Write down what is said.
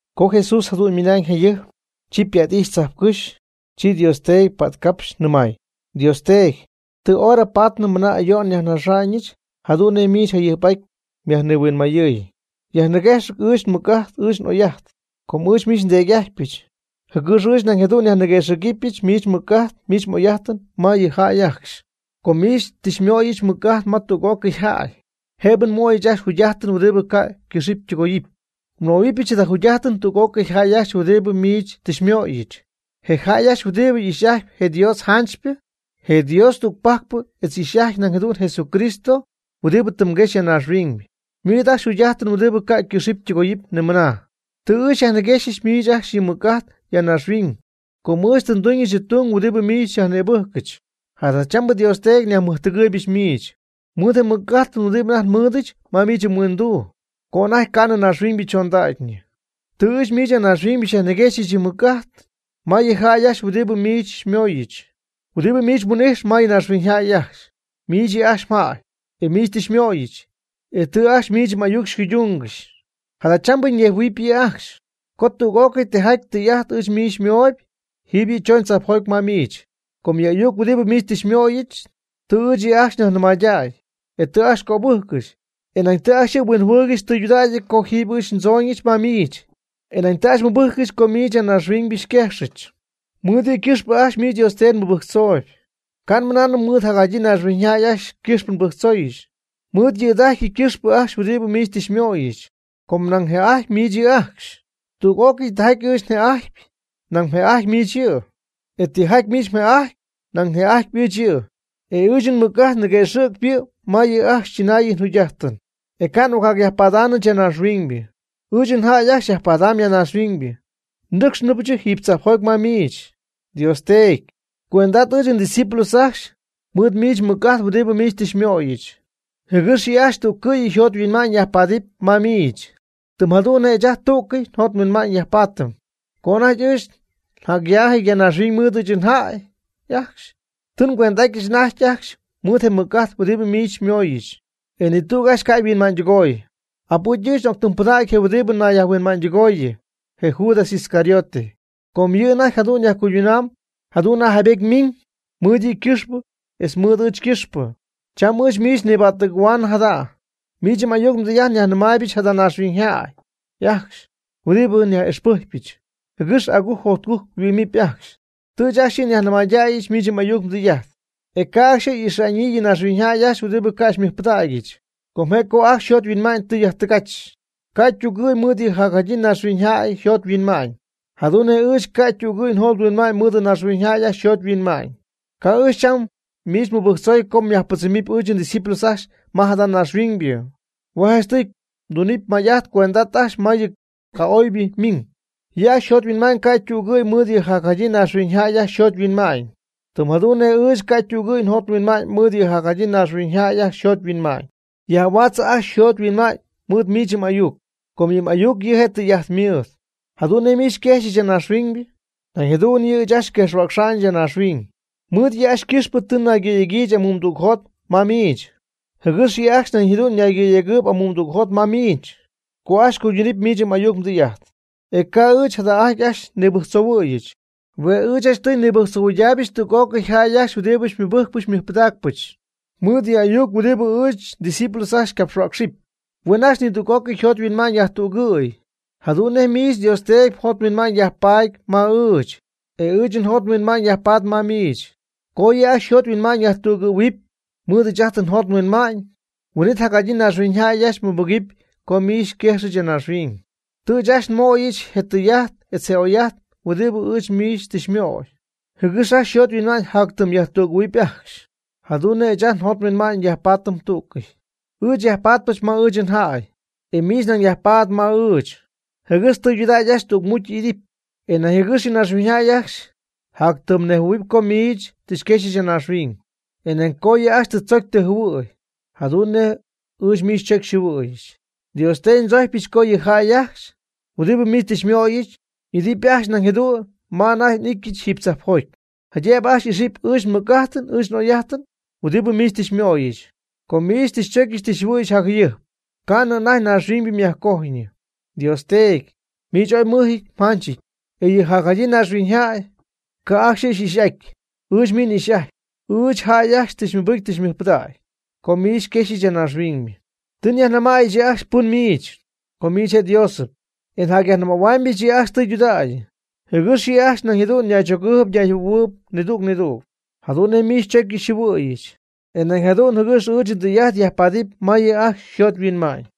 Co Jesús jadu'n ymɨnañ jayɨjp, chi ypa't'ijxy tzajpcɨ́xy, chi Dios Teedy pa'tcapxy nɨmay: ―Dios Teedy, tɨ hora paady mɨna ayo'n nyajnaxa'ñɨch jadu'n nej miich jayɨjp'aty myajnihuinmayɨɨy. Yajniguëxɨ̈g ɨɨch nmɨc'ajt ɨɨch n'oy'ajt, com ɨɨch miich nDeedy'ajtypɨch, jɨgɨx ɨɨch nañ jadu'n nyajniguëxɨ̈gɨbyɨch miich mmɨc'ajt miich m'oy'ajt ma yɨ jäy ajcxy. Com miich tɨ xymöyɨch mɨc'ajt ma tüg'ócɨy jäy, jëbɨ nmöyɨch ajcxy jugy'ajtɨn huɨdibɨ ca' ycɨxɨpy ytɨgoyɨpy. Nmöhuɨbyɨch jada jugy'ajtɨn tüg'ócɨy jäy ajcxy huɨdibɨ miich tɨ xymöyɨch. Je jäy ajcxy huɨdibɨ ixy'ajtp je Dios janchypɨ, je Dios tügpajcpɨ etz y'ixy'ajtyp nañ jadu'n Jesucristo huɨdibɨ tɨ mguexy ya naaxhuiñ, ymɨɨd ajcxy jugy'ajtɨn huɨdibɨ ca'ycɨxɨpy ytɨgoyɨpy nimɨnaa. Tɨ ɨɨch nyajniguëxɨ̈gyɨch miich ajcxy yɨ nmɨc'ajt ya naaxhuiñ, co ɨɨch tɨ nduñ yɨ mdung huɨdibɨ miich xyajnïbɨjcɨch. Jadachambɨ Dios Teedy yajmɨjtɨgɨɨygɨch miich, mɨɨd je mɨc'ajtɨn huɨdibɨ anajty nmɨɨdɨch ma miich mhuinduu co anajty ca'nɨ naaxhuiñybɨ chondacyñɨ. Tɨ ɨɨch miich ya naaxhuiñ nyajniguëxɨ̈cɨ yɨ nmɨc'ajt ma yɨ jäy ajcxy huɨdibɨ miich xymooyɨch, huɨdibɨ miich mhuin'ijx ma naaxhuiñyjäy ajcxy. Miich yɨ' ajcxy mjäy, e miich tɨ xymöyɨch, e tɨ ajcxy miich m'ayuc cuydungɨxy. Jadachambɨ ñejhuɨɨyñɨp yɨ' ajcxy, co tüg'ócɨy tijaty tɨy'ajt ɨɨch miich yɨ' xymooyb, jiiby yɨ' chooñ tzajpjoty ma miich. Com yɨ ayuc huɨdibɨ miich tɨ xymöyɨch, tɨ ɨɨch yɨ' ajcxy nyajnɨmaydäy, e tɨ yɨ' ajcxy cöbɨjccɨxy. E nañ tɨ ajcxy huinjɨhuɨɨygɨxy tɨydudägy co ɨɨch jiiby ndzooñɨch ma miich, e nañ tɨ ajcxy mɨbɨjccɨxy co miich ya naaxhuiñ xyquejxyɨch. Mɨɨd yɨ' ycɨxpɨ ajcxy miich Dios Teedy nmɨbɨjctzooy, ca' nmɨnaanɨm mɨɨd jacjadyii naaxhuiñyjäy ajcxy ycɨxpɨ nmɨbɨjctzoy. Mɨɨd yɨ̈da'ajty ycɨxpɨ ajcxy huɨdibɨ miich tɨ xymöyɨch, com nañ mjë'ajtyp miich yɨ' ajcxy. Tüg'ócɨy tijaty ɨɨch një'ajtyp, nañ mjë'ajtyp miich yɨ', e tijaty miich mjë'ajtyp nañ një'ajtyp ɨɨch yɨ'; e ɨɨch nmɨc'ajt niguëxɨ'cp yɨ' ma yɨ' ajcxy chɨnaayɨn yjugy'ajtɨn. E ca' n'ocjacyajpadaanɨch ya naaxhuiñ. Ɨɨch njäy ajcxy jacyajpadam ya naaxhuiñ. Nnɨ́cxnɨbɨch jiiby tzajpjoty ma miich. Dios Teedy, cuend'at ɨɨch ndiscípulos ajcxy mɨɨd miich mmɨc'ajt huɨdibɨ miich tɨ xymöyɨch, jɨgɨx yɨ' ajcxy tú'cɨy yjot yhuinma'ñ yajpaadɨpy ma miich, tɨm jadu'n nej ɨɨch ajt tú'cɨy njot nhuinma'ñ nyajpaatɨm. Co anajty ɨɨch njac'yaajɨty naaxhuiñ mɨɨd ɨɨch njäy ajcxy, tɨ ngüend'atyɨch anajty ajcxy mɨɨd je mɨc'ajt huɨdibɨ miich xymooyɨch. E ni tüg ajcxy ca' yhuinma'ñydɨgooy. Abɨcy ɨɨch n'octɨmpɨdägy je huɨdibɨ nayyajhuinma'ñydɨgooyɨ (je Judas Iscariote), co yɨ' anajty jadu'n yajcuydunam jadu'n nej jaybety ymiiñ mɨɨd yɨ' ycɨxpɨ etz mɨɨd ɨɨch ycɨxpɨ. Cham ɨɨch miich niba'ttɨgɨ̈huaanɨ jada'. Miich m'ayuc mdɨy'ajt nyajnɨmaaybɨch jada naaxhuiñyjäy ajcxy huɨdibɨ nyaj'ixpɨjcypɨch, jɨgɨx agujc jotcujc yhuɨ'mɨp ajcxy. Tɨ ɨɨch ajcxy yɨ' nyajnɨmaydäyɨch miich m'ayuc mdɨy'ajt. E ca' ajcxy y'ixa'ñyii yɨ naaxhuiñyjäy ajcxy huɨdibɨ ca' xymɨjpɨdägyɨch. Com je' co ajcxy yjot yhuinma'ñ tɨ yajtɨgach, ca' ytügɨ̈y mɨɨd yɨ jacjadyii naaxhuiñyjäy yjot yhuinma'ñ. Jadu'n nej ɨɨch ca' ytügɨ̈y njot nhuinma'ñ mɨɨd naaxhuiñyjäy ajcxy yjot yhuinma'ñ. Ca' ɨɨch cham miich nmɨbɨjctzoy co myajpɨdzɨmɨpy ɨɨch ndiscípulos ajcxy ma jada naaxhuiñybɨ. Hue' janchtɨy tun may'ajt cuend'at ajcxy ma yɨ ca'oybɨ ymiiñ. Yɨ' ajcxy yjot yhuinma'ñ ca' ytügɨ̈y mɨɨd yɨ jacjadyii naaxhuiñyjäy ajcxy yjot yhuinma'ñ. Tɨm jadu'n nej ɨɨch ca' ytügɨ̈y njot nhuinma'ñ mɨɨd yɨ jacjadyii naaxhuiñyjäy ajcxy yjot yhuinma'ñ. Yajhuaatzɨ ajcxy yjot yhuinma'ñ mɨɨd miich m'ayuc, com yɨ m'ayuc yɨ' je' tɨy'ajt mɨɨd. Jadu'n nej miich xyquejxyɨch ya naaxhuiñ, nañ jadu'n ɨɨch yɨ' ajcxy nguejxhuäcxyɨch ya naaxhuiñ. Mɨɨd yɨ' ajcxy ycɨxpɨ tɨ nnaygɨ̈yegyiijɨch amuumdügjot ma miich, jɨgɨx yɨ' ajcxy nañ jadu'n ñaygɨ̈yegɨɨyb amuumdügjot ma miich, co ajcxy cuydunɨpy miich m'ayuc mdɨy'ajt. E ca' ɨɨch jada'ajty ajcxy nibɨjctzohuɨ̈yɨch. Hue' ɨɨch janchtɨy nibɨjctzohuɨydaaybɨch tüg'ócɨy jäy ajcxy huɨdibɨ xymɨbɨ́jcɨbɨch xymɨjpɨdägɨbɨch mɨɨd yɨ ayuc huɨdibɨ ɨɨch ndiscípulos ajcxy ycapxhuäcxɨpy. Huen ajcxy nidüg'ócɨy yjot yhuinma'ñ yajtügɨ̈y, jadu'n nej miich Dios Teedy mjot mhuinma'ñ yajpaady ma ɨɨch, e ɨɨch njot nhuinma'ñ yajpaady ma miich. Co yɨ' ajcxy yjot yhuinma'ñ yajtügɨ̈huɨpy mɨɨd ɨɨch ajt njot nhuinma'ñ, huin'it jacjadyii naaxhuiñyjäy ajcxy mɨbɨgɨpy co miich xyquejxyɨch ya naaxhuiñ. Tɨ ɨɨch ajcxy nmöyɨch je tɨy'ajt etz je oy'ajt huɨdibɨ ɨɨch miich tɨ xymöy, jɨgɨx ajcxy yjot yhuinma'ñ jatyɨmy yajtügɨ̈huɨpy ajcxy, jadu'n nej ɨɨch ajt njot nhuinma'ñ yajpaatɨm tú'cɨy. Ɨɨch yajpatpɨch ma ɨɨch njäy, e miich nañ myajpatp ma ɨɨch, jɨgɨx tɨydudägy ajcxy tügmucy y'idɨpy, e nañ jɨgɨx naaxhuiñyjäy ajcxy jatyɨmy nejhuɨ̈huɨpy co miich xyquejxyɨch ya naaxhuiñ, e nañ co yɨ' ajcxy tɨ mdzocy tɨ mjɨhuɨ̈y jadu'n nej ɨɨch miich xychocy xyjɨhuɨ̈yɨch. Dios Teedy ndzojcpyɨch co yɨ jäy ajcxy huɨdibɨ miich tɨ xymöyɨch y'idɨpy ajcxy nañ jadu'n ma anajty n'ityɨch jiiby tzajpjoty, jaydëbɨ ajcxy ixɨpy ɨɨch nmɨc'ajt ɨɨch n'oy'ajt huɨdibɨ miich tɨ xymöyɨch. Com miich tɨ xychocy tɨ xyjɨhuɨ̈yɨch jacjayɨjp ca'nɨ anajty naaxhuiñybɨ myajcojyñɨ. Dios Teedy, miich ooy mmɨjɨty mjanchɨty, e yɨ jacjadyii naaxhuiñyjäy ca' ajcxy yɨ' xy'ixy'ajtyp. Ɨɨch miich n'ixy'ajtyp. Ɨɨch njäy ajcxy tɨ mɨbɨcy tɨ mɨjpɨdägy co miich xyquejxyɨch ya naaxhuiñ. Tɨ nyajnɨmaayɨch yɨ' ajcxy pɨn miich, co miich je' Diosɨp. E njacyajnɨmähuaamyɨch yɨ' ajcxy tɨydudägy, jɨgɨx yɨ' ajcxy nañ jadu'n ñaychogɨɨyb ñayjɨhuɨ̈huɨɨyb nidüg nidüg, jadu'n nej miich xychocyɨch xyjɨhuɨ̈yɨch, e nañ jadu'n jɨgɨx ɨɨch ndɨy'ajt yajpaadɨpy ma yɨ' ajcxy yjot yhuinma'ñ.